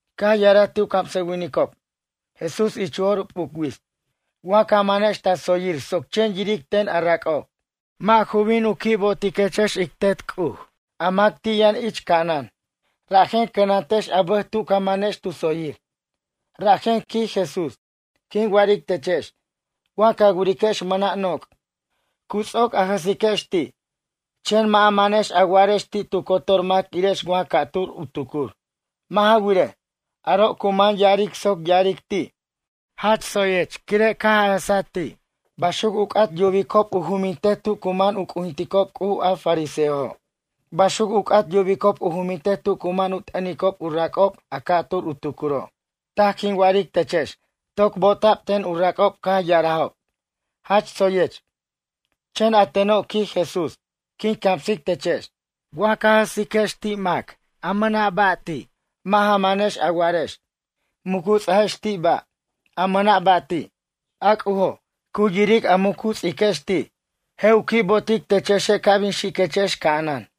Caj ya'araj ti' u camsʌwinicob, Jesús ich u jo'r p'uc wits: ―Wa ca manex ta tsoyir soc chen yiric ten a rac'ob. Mʌ' ju bin u qui' bo'otiquechex ic Tet C'uj a mac ti' yʌn ich ca'anan. Rajen cʌnantechex a bʌj tu ca manex tu tsoyir. Rajen ―quij Jesús―, quin wa'aric techex. Wa ca wiriquex mʌna' noc'. Cu ts'oc a jʌsiquex ti', chen mʌ' a manex a wa'arex ti' tu cotor mac irex wa ca'tur u tucur. Mʌ' ja wirej, aro' cu man ya'aric soc ya'aric ti': “Jach tsoyech quire' caj a jʌsaj ti'.” Baxuc u c'at yubicob u jumintej tu cu man u c'ujinticob C'uj a fariseojo'. Baxuc u c'at yubicob u jumintej tu cu man u t'ʌnicob u rac'ob a ca'tur u tucuro'. Taj quin wa'aric techex, toc bo'ota'b ten u rac'ob caj ya'arajob: “Jach tsoyech.” Chen a teno' ―quij Jesús―, quin camsic techex. Wa ca jʌsiquex mac mʌna' ba' ti'. Mʌ' ja manex a wa'arex. Muc u ts'ajex ti' ba', a mʌna' ba' ti'. A C'ujo', cu yiric a muc u ts'iquex ti'. Je' u qui' bo'otic techexe' ca' bin xiquechex ca'anan.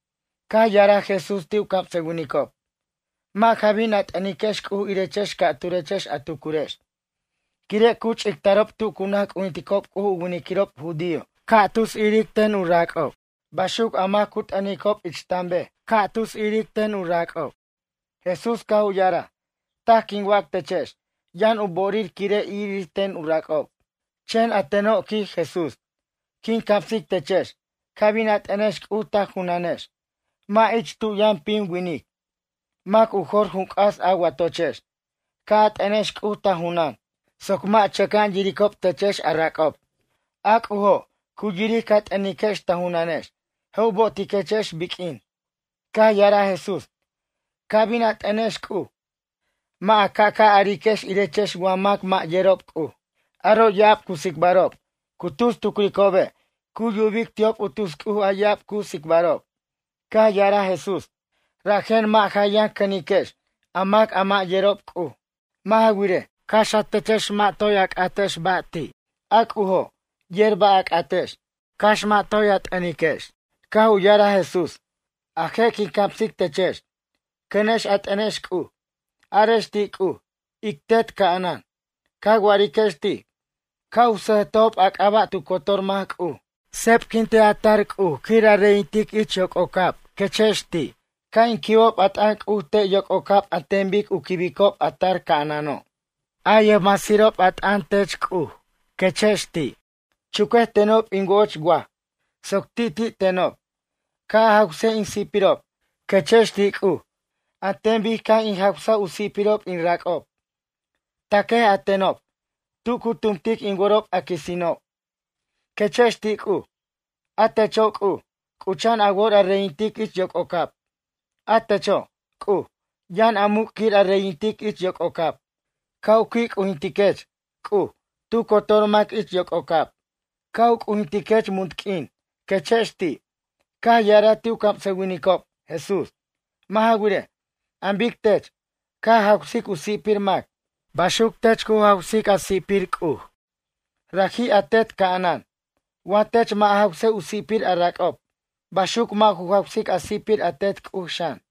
Caj ya'araj Jesús ti' u camsʌwinicob: ―Mʌ' ja bin a t'ʌnex C'uj irechex ca'turex a tucurex. Quire' cu ch'ictarob tu cu naj c'ujinticob C'uj u winiquirob judío ca' tus iric ten u rac'ob. Baxuc a mac cu t'ʌnicob ich tanbej, ca' tus iric ten u rac'ob. Jesús caj u ya'araj: ―Taj quin wac techex. Yʌn u bo'orir quire' irir ten u rac'ob. Chen a teno' ―quij Jesús―. Quin camsic techex, ca' bin a t'ʌnex C'uj ta junanex. Mʌ' ich tu yʌn pim winic. Mʌc u jor jun c'as a watochex, ca' a t'ʌnex C'uj ta junʌn, soc mʌ' chʌca'an yiricob techex a rac'ob. A C'ujo', cu yiric ca t'ʌniquex ta junanex, je' u bo'otiquechex biq'uin. Caj ya'araj Jesús: ―Ca' bin a t'ʌnex C'uj, mʌ' a ca'ca' ariquex irechex wa mac mʌ' yerob C'uj. Aro' ya'ab cu tsicbarob. Cu tus tucricobe', cu yubic ti'ob u tus C'uj a ya'ab cu tsicbarob. Caj ya'araj Jesús: ―Rajen mʌ' ja yʌn cʌniquex, a mac a mʌ' yerob C'uj. Mʌ' ja wirej, cax a techex mʌ' toj a c'atex ba' ti'. A C'ujo', yer ba' a c'atex, cax mʌ' toj a t'ʌniquex. Caj u ya'araj Jesús: ―A je' quin camsic techex. Cʌnex a t'ʌnex C'uj. Arex ti' C'uj: Ic Tet ca'anan, ca wa'ariquex ti'. Ca' u sʌjtejob a c'aba' tu cotor mac, C'uj. Sebquintej a tar C'uj quir a reyintic C'uj ich yoc'ocab ―quechex ti'―. Ca' in quibob a t'ʌn C'uj te' yoc'ocab an ten bic u quibicob a tar ca'anano', a yʌjmasirob a t'ʌn tech C'uj ―quechex ti'―. Chuquej tenob in wo'och waj, soc ti'ti' tenob. Ca' a jawsej in si'pirob ―quechex ti' C'uj―, an ten bic ca' in jawsej u si'pirob in rac'ob. Taquej a tenob, tu cu tumtic in worob a quisino' ―quechex ti' C'uj―. A techo', C'uj, c'ucha'an a wor a reyintic ich yoc'ocab. A techo', C'uj, yʌn a muc' quir a reyintic ich yoc'ocab. Ca' u qui' c'ujintiquech, C'uj, tu cotor mac ich yoc'ocab. Ca' u c'ujintiquech munt q'uin ―quechex ti'. Caj ya'araj ti' u camsʌwinicob, Jesús: ―Mʌ' ja wirej, an bic tech, ca jawsic u si'pir mac. Baxuc tech cu jawsic a si'pir C'uj. Raji' a Tet ca'anan. Wa tech mʌ' ja jawsej u si'pir a rac'ob, baxuc mʌ' ju jawsic a si'pir a Tet C'uj xan.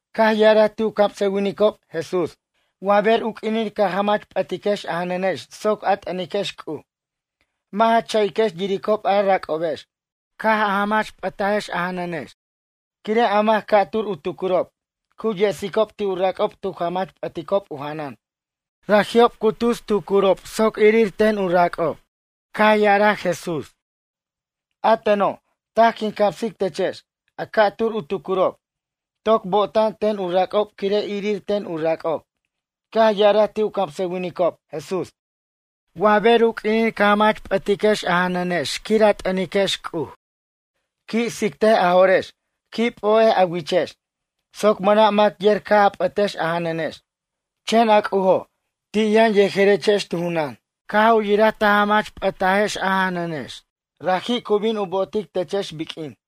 Caj ya'araj ti' u camsʌwinicob, Jesús: ―Wa ber u q'uinin ca jamach p'ʌtiquex a janʌnex soc a t'ʌniquex C'uj. Mʌ' ja cha'iquex yiricob a rac'obex, caj a jamach p'ʌtajex a janʌnex. Quire' a mac ca'tur u tucurob, cu yesicob ti' u rac'ob tu jamach p'ʌticob u janan. Raji'ob cu tus tucurob soc irir ten u rac'ob. Ya'araj Jesús: ―A teno', taj quin camsic techex. A ca'tur u tucurob, toc bo'ta'an ten u rac'ob quire' irir ten u rac'ob. Caj ya'araj ti' u camsʌwinicob, Jesús: ―Wa ber u q'uinin ca jamach p'ʌtiquex a janʌnex quir a t'ʌniquex C'uj. Qui' tsictej a jo'rex. Qui' p'o'ej a wichex soc mʌna' mac yer caj a p'ʌtex a janʌnex. Chen a C'ujo', ti' yʌn yejerechex tu junan, caj u yiraj ta jamach p'ʌtajex a janʌnex. Raji' cu bin u bo'otic techex biq'uin.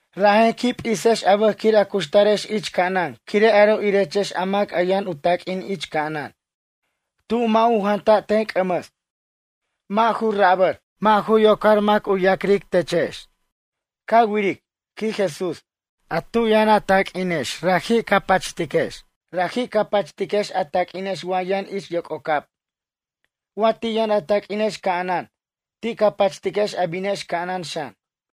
’Rajen qui' p'isex a bʌj quir a cuxtarex ich ca'anan, quire' aro' irechex a mac yʌn u taq'uin ich ca'anan. Tu mʌ' u janta' ten c'ʌmʌs. Mʌ' ju rapar, mʌ' ju yocar mac u ya'cric techex. Ca wiric ―quij Jesús―, a tu yʌn a taq'uinex raji' ca pachtiquex. Raji' ca pachtiquex a taq'uinex wa yʌn ich yoc'ocab. Wa ti' yʌn a taq'uinex ca'anan, ti' ca pachtiquex a binex ca'anan xan.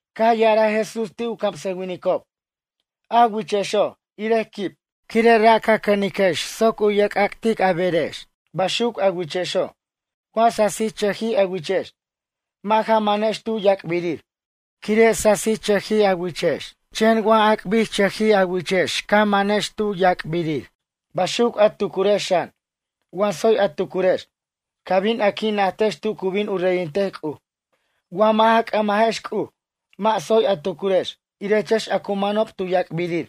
Caj ya'araj Jesús ti' u camsʌwinicob: ―A wichexo' irej quib. Quire' ra' ca c'ʌniquex soc u yerc'ac'tic a berex. Baxuc a wichexo', wa sasirchʌji a wichex, mʌ' ja manex tu yac'birir, quire' sasirchʌjij a wichex. Chen waj ac'birchʌjij a wichex ca manex tu yac'birir. Baxuc a tucurex xan. Wa tsoy a tucurex, ca bin a qui' najtex tu cu bin u reyintej C'uj. Wa mʌ' ja c'ʌmajex C'uj, mʌ' tsoy a tucurex, irechex a cu manob tu yac'birir,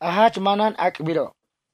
a jach manan ac'biro'.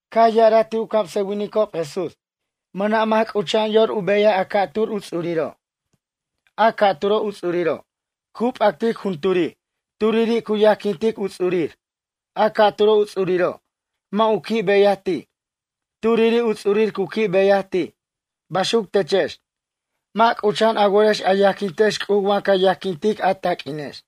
Caj ya'araj ti' u camsʌwinicob, Jesús: ―Mʌna' mac c'ucha'an yor u beyaj a ca'tur u ts'uriro'. A ca'turo' u ts'uriro', cu p'actic junturi'. Turiri' cu yajquintic u ts'urir. A ca'turo' u ts'uriro', mʌ' u qui' beyaj ti'. Turiri' u ts'urir cu qui' beyaj ti'. Baxuc techex, mʌ' c'ucha'an a worex a yajquintex C'uj wa ca yajquintex a taq'uinex.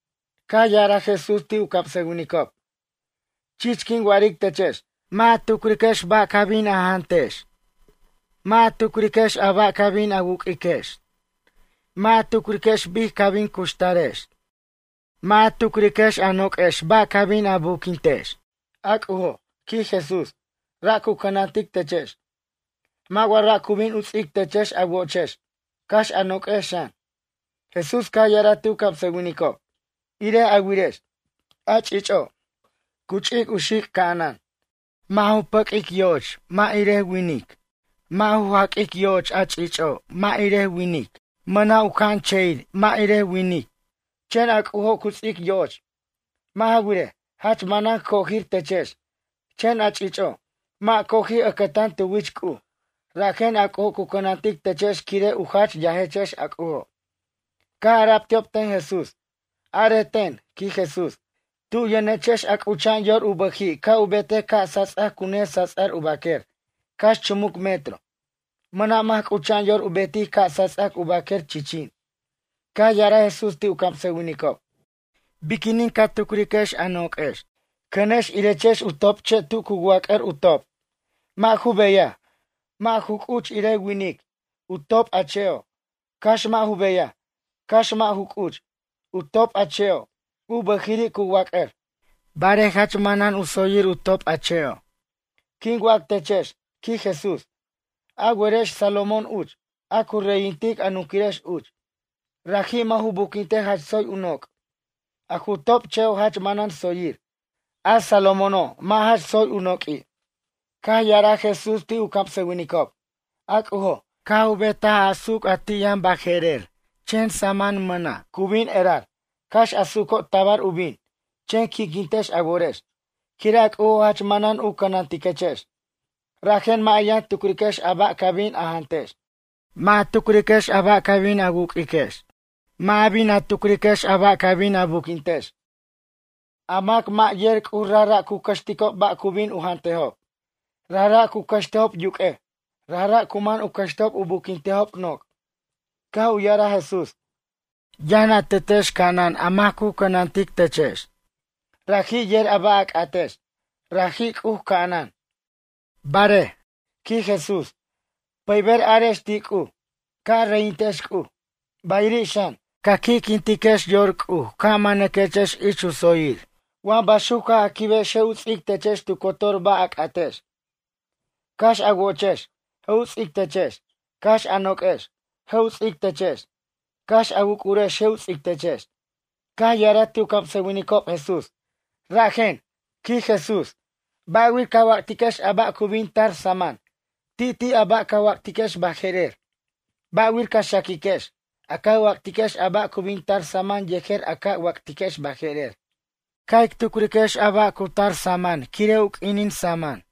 Caj ya'araj Jesús ti' u camsʌwinicob: ―Chich quin wa'aric techex. Mʌ' ja tucriquex ba' ca bin a jantex. Mʌ' ja tucriquex a ba' ca bin a wuq'uiquex. Mʌ' ja tucriquex bic ca bin cuxtarex. Mʌ' ja tucriquex a noq'uex ba' ca bin a buquintex. A C'ujo' ―quij Jesús―, ra' cu cʌnantic techex. Mʌ' wa ra' cu bin u ts'ic techex a wo'ochex, cax a noq'uex xan? Jesús caj ya'araj ti' u camsʌwinicob: ―Irej a wirex. A ch'ich'o', cu ch'ic u xic' ca'anan. Mʌ' ju pʌq'uicob yo'och irej winic. Mʌ' ju jaq'uicob yo'och a ch'ich'o', irej winic. Mʌna' u ca'anche'ir irej winiquir. Chen a C'ujo' cu ts'ic yo'och. Mʌ' ja wirej, jach manan cojir techex, chen a ch'ich'o', mʌ' coji' ʌcʌtan tu wich C'uj. Rajen a C'ujo' cu cʌnantic techex quire' u jach yajechex a C'ujo'. Caj ara'b ti'ob ten Jesús: ―Arej ten ―quij Jesús―, tu yʌnechex a c'ucha'an yor u bʌji' ca' u betej ca' sats'ac cu nesats'ar u baquer, cax chumuc metro? Mʌna' mac c'ucha'an yor u betic ca' sats'ac u baquer chichin. Caj ya'araj Jesús ti' u camsʌwinicob: ―Biquinin ca tucriquex a noq'uex? Cʌnex irechex u top'che' tu cu wac'ar u top'. Mʌ' ju beyaj, mʌ' ju c'uch irej winic, u top' a che'o'. Cax mʌ' ju beyaj, cax mʌ' ju c'uch. U top' a che'o', u bʌjiri' cu wac'ar, barej jach manan u tsoyir u top' a che'o'. Quin wac techex ―quij Jesús―. A werex Salomón uch, a cu reyintic a nunquirex uch. Raji' mʌ' ju buquintej jach tsoy u noc'. A ju top' che'o' jach manan tsoyir. A Salomóno' mʌ' jach tsoy u noq'ui'. Caj ya'araj Jesús ti' u camsʌwinicob: ―A C'ujo', caj u betaj a su'uc a ti' yʌn baje'rer chen samʌn mʌna'. Cu bin erar. Cax a su'uco' tabar u bin, chen qui'quintex a worex, quire' a C'ujo' jach manan u cʌnantiquechex. Rajen mʌ' a yʌn tucriquex a ba' ca bin a jantex. Mʌ' ja tucriquex a ba' ca bin a wuq'uiquex. Mʌ' ca bin a tucriquex a ba' ca bin a buquintex. A mac mʌ' yer C'uj rajra' cu cʌxticob ba' cu bin u jantejob. Rajra' cu cʌxtejob yuq'uej. Rajra' cu man u cʌxtejob u buquintejob noc'. Caj u ya'araj Jesús: ―Yʌn a Tetex ca'anan a mac cu cʌnantic techex. Raji' yer a ba' a c'atex. Raji' C'uj ca'anan. Barej ―quij Jesús―, pʌyber arex ti' C'uj: Ca' a reyintex C'uj. Bayiri' xan, ca' qui'quintaquex yor C'uj ca' manaquex ich u tsoyir. Wa baxuc caj a quibex je' u ts'ic techex tu cotor ba' a c'atex. Cax a wo'ochex, je' u ts'ic techex. Cax a noq'uex, je' u ts'ic techex. Cax a wuc'urex je' u ts'ic techex. Caj ya'araj ti' u camsʌwinicob Jesús: ―Rajen ―quij Jesús―, ba'wir ca wac'tiquex a ba' ca' bin tac samʌn. Ti' ti' a ba' ca wac'tiquex baje'rer. Ba'wir ca xaquiquex, a ca wac'tiquex a ba' cu bin tar samʌn yejer a ca wac'tiquex baje'rer. Ca' ic tucriquex a ba' cu tar samʌn quire' u q'uinin samʌni'.